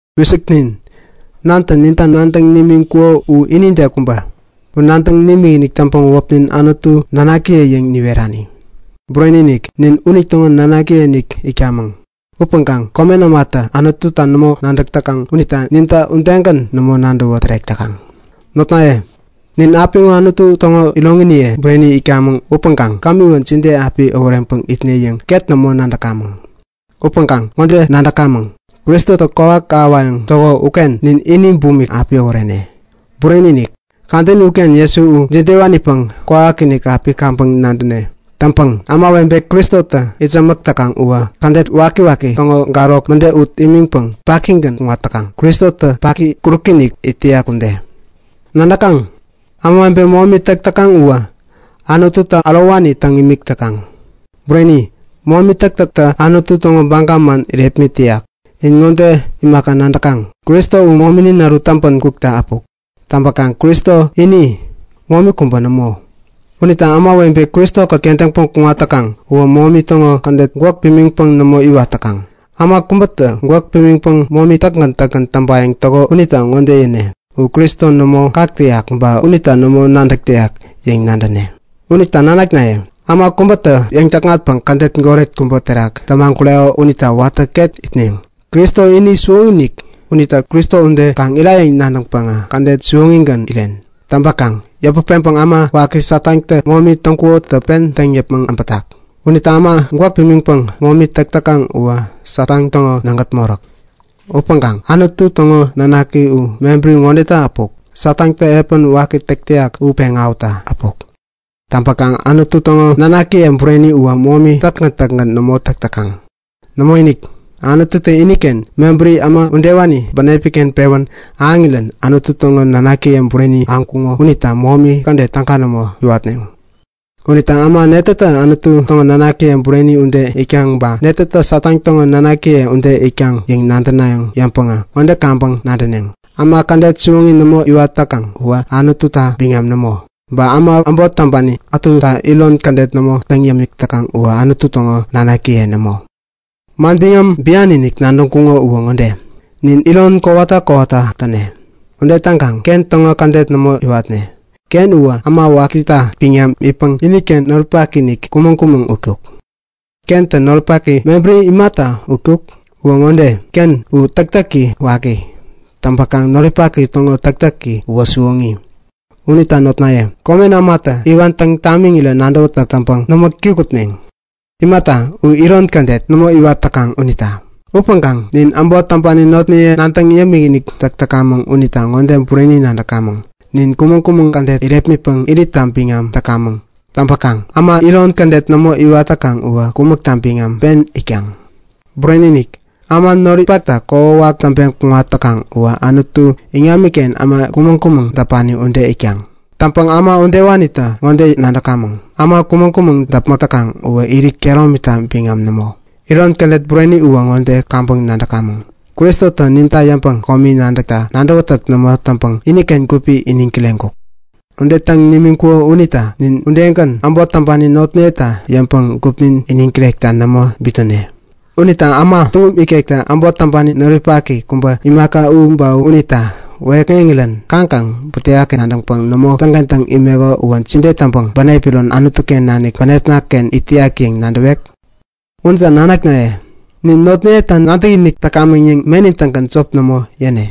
Wisiknin! Nantä ninta nadäŋ nimiŋkuko u inide kubä! U nadäŋ nimikinik täŋpäŋ wäpnin Nanaknaye yäŋ niwerani. Bureni-inik, nin unitäŋo nanakiye-inik itkamäŋ. Upäŋkaŋ komen ämatä Anututa nämo nadäk täkaŋ unita ninta udegän nämo nadäwä tärek täkaŋ. Notnaye, nin apiŋo Anutu täŋo iroŋiniye bureni itkamäŋ upäŋkaŋ kämiwä jide api äworeŋpäŋ itne yäŋ ket nämo nadäk täkamäŋ. Upäŋkaŋ ŋode nadäk täkamäŋ; Kristotä kwawak ahäwayäŋ täko uken nin ini bumik api äworene. Bureni-inik, kadäni uken Jesu u jidewanipäŋ kwawakinik api kaŋpäŋ nadäne. Täŋpäŋ ämawebe Kristota itsämäk täkaŋ uwä, kädet wakiwaki täŋo garok mäde ut imiŋpäŋ pakigän kuŋat täkaŋ, Kristotä paki, kuräki-inik it täyak ude. Ämawebe momi täk täkaŋ uwä, Anututa ärowani täŋ imik täkaŋ. Bureni, momi täktäktä Anutu täŋo baga man irepmit täyak. Ba ŋode imaka nadäk täkaŋ; Kristo u mominin ärut täŋpä kukta äpuk. Täŋpäkaŋ Kristo ini, momi kubä nämo. Unita ämawebe Kristo-kät kentäŋpäŋ kuŋat täkaŋ uwä momi täŋo kädet gwäk pimiŋpäŋ nämo iwat täkaŋ. Äma kubätä gwäk pimiŋpäŋ momi täkgän täkgän täŋpayäŋ täko unita ŋode yäne; U Kristo nämo kak täyak ba unita nämo nadäk täyak yäŋ nadäne. Unita nanaknaye, äma kubätä yäŋ-täkŋatpäŋ kädet goret kubä terak tämagureko unita watä ket itneŋ. Kristo u siwoŋi-inik, unita Kristo ude kaŋ itnayäŋ nadäŋpäŋä kädet siwoŋigän iwatneŋ. Täŋpäkaŋ yäput peŋpäŋ äma waki Satantä momi täŋkukotä pen täŋ yäpmäŋ äbätak. Unita äma gwäk pimiŋpäŋ momi täk täkaŋ uwä Satan täŋo nägät moräk. Upäŋkaŋ Anutu täŋo nanaki u mebäri ŋodeta äpuk; Satantä epän waki täk täyak u peŋ awähutta äpuk. Täŋpäkaŋ Anutu täŋo nanakiye bureni uwä momi täkgän täkgän nämo täk täkaŋ. Nämoinik, Anututä iniken mebäri äma udewani bänepi-ken pewän ahäŋirän Anutu täŋo nanakiye bureni ahäŋkuŋo unita momi kädet täga nämo iwatneŋ. Unita äma netätä Anutu täŋo nanakiye bureni ude itkaŋ ba netätä Satan täŋo nanakiye ude itkaŋ yäŋ nadäna yäŋpäŋ ŋode yabäŋpäŋ-nadäneŋ; Äma kädet siwoŋi nämo iwat täkaŋ uwä Anututa biŋam nämo. Ba äma äbot täŋpani ätuta iron kädet nämo täŋ yämik täkaŋ uwä Anutu täŋo nanakiye nämo. Manbiŋam bian-inik nadäŋkuŋo uwä ŋode; Nin iron kowata kowata täne. Ude täŋkaŋ Ken täŋo kädet nämo iwatne. Ken uwä äma wakita biŋam itpäŋ iniken noripaki-inik kumäŋ-kumäŋ utkuk. Kentä noripaki mebäri imata utkuk? Uwä ŋode; Ken u täktäki waki. Täŋpäkaŋ noripaki täŋo täktäki uwä siwoŋi. Unita notnaye, komen ämatä iwan täŋ tamiŋirä nadäwätäk täŋpäŋ nämo kikŋutneŋ. Imata, u iron kädet nämo iwat täkaŋ unita. Upäŋkaŋ nin äbot täŋpani notniye nadäŋ yämikinik täk täkamäŋ unita bureni ŋode nadäk täkamäŋ; Nin kumäŋ-kumäŋ kädet irepmitpäŋ iritta biŋam täkamäŋ. Täŋpäkaŋ äma iron kädet nämo iwat täkaŋ uwä kumäkta biŋam pen itkaŋ. Bureni-inik! Äma noripakta kokwawak täŋpeŋ kuŋat täkaŋ uwä Anutu iŋamiken äma kumäŋ-kumäŋ däpani ude it täkaŋ. Täŋpäŋ äma udewanita ŋode nadäkamäŋ; Äma kumäŋ-kumäŋ däpmäk täkaŋ uwä irit kehäromita biŋam nämo. Iron kädet bureni uwä ŋode kaŋpäŋ nadäk täkamäŋ; Kristotä ninta yäŋpäŋ komi nadäkta nadäwätäk nämo täŋpäŋ iniken gupi iniŋ kireŋkuk. Ude täŋ nimiŋkuko unita nin udegän äbot täŋpani notniyeta yäŋpäŋ gupnin iniŋ kirekta nämo bitnäne. Unita äma tuŋum ikektä äbot täŋpani noripaki kubä imaka u ba unita wäyäkŋeŋirän kaŋkaŋ butewaki nadäŋpäŋ nämo täŋkentäŋ imeko uwä jide täŋpäŋ bänep iron Anutu-ken nanik bänepna-ken itak yäŋ nadäwek? Unita nanaknaye, nin notniyeta nadäkinik täkamäŋ yäŋ menin-tägän jop nämo yäne.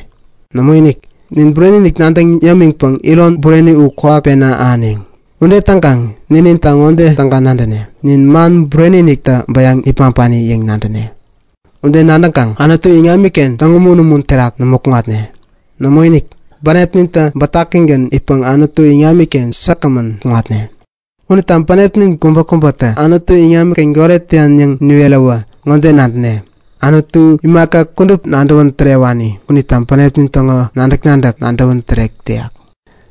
Nämoinik, nin bureni-inik nadäŋ yämiŋpäŋ iron bureni u kwawak pena ahäneŋ. Ude täŋkaŋ nininta ŋode täga nadäne; Nin man bureni-iniktä bäyaŋ nipmaŋpani yäŋ nadäne. Ude nadäŋkaŋ Anutu iŋamiken täŋumun-umun terak nämo kuŋatne. Nämoinik, bänepnintä bätakigän itpäŋ Anutu iŋamiken säkgämän kuŋatne. Unita bänepnin kubäkubätä Anutu iŋamiken goret täyan yäŋ niweräwä ŋode nadäne; Anutu imaka kudup nadäwän tärewani unitä bänepnin täŋo nadäk-nadäk nadäwän tärek täkaŋ.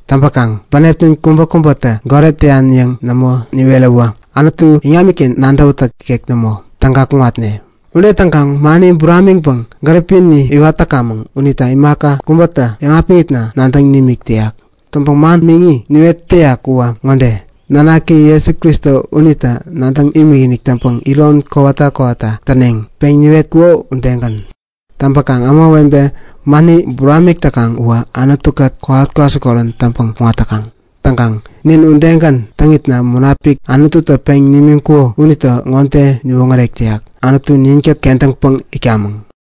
Täŋpäkaŋ bänepnin kubäkubätä goret täyan yäŋ nämo niweräwä Anutu iŋamiken nadäwätäk ikek nämo, täga kuŋatne. Ude täŋkaŋ mani buramiŋpäŋ gäripini iwat täkamäŋ unita imaka kubäta yäŋapiŋitna nadäŋ nimik täyak. Täŋpäŋ man miŋi niwet täyak uwä ŋode; Nanaki Jesu Kristo unita nadäŋ imikinik täŋpäŋ iron kowata kowata täneŋ, peŋ niwetkuko udegän. Täŋpäkaŋ ämawebe mani buramik täkaŋ uwä Anutu-kät kowat kwasikorän täŋpäŋ kuŋat täkaŋ. Täŋkaŋ nin udegän täŋitna Munapik Anututä peŋ nimiŋkuko unitä ŋode niwoŋärek täyak; Anutu ninkät kentäŋpäŋ itkamäŋ.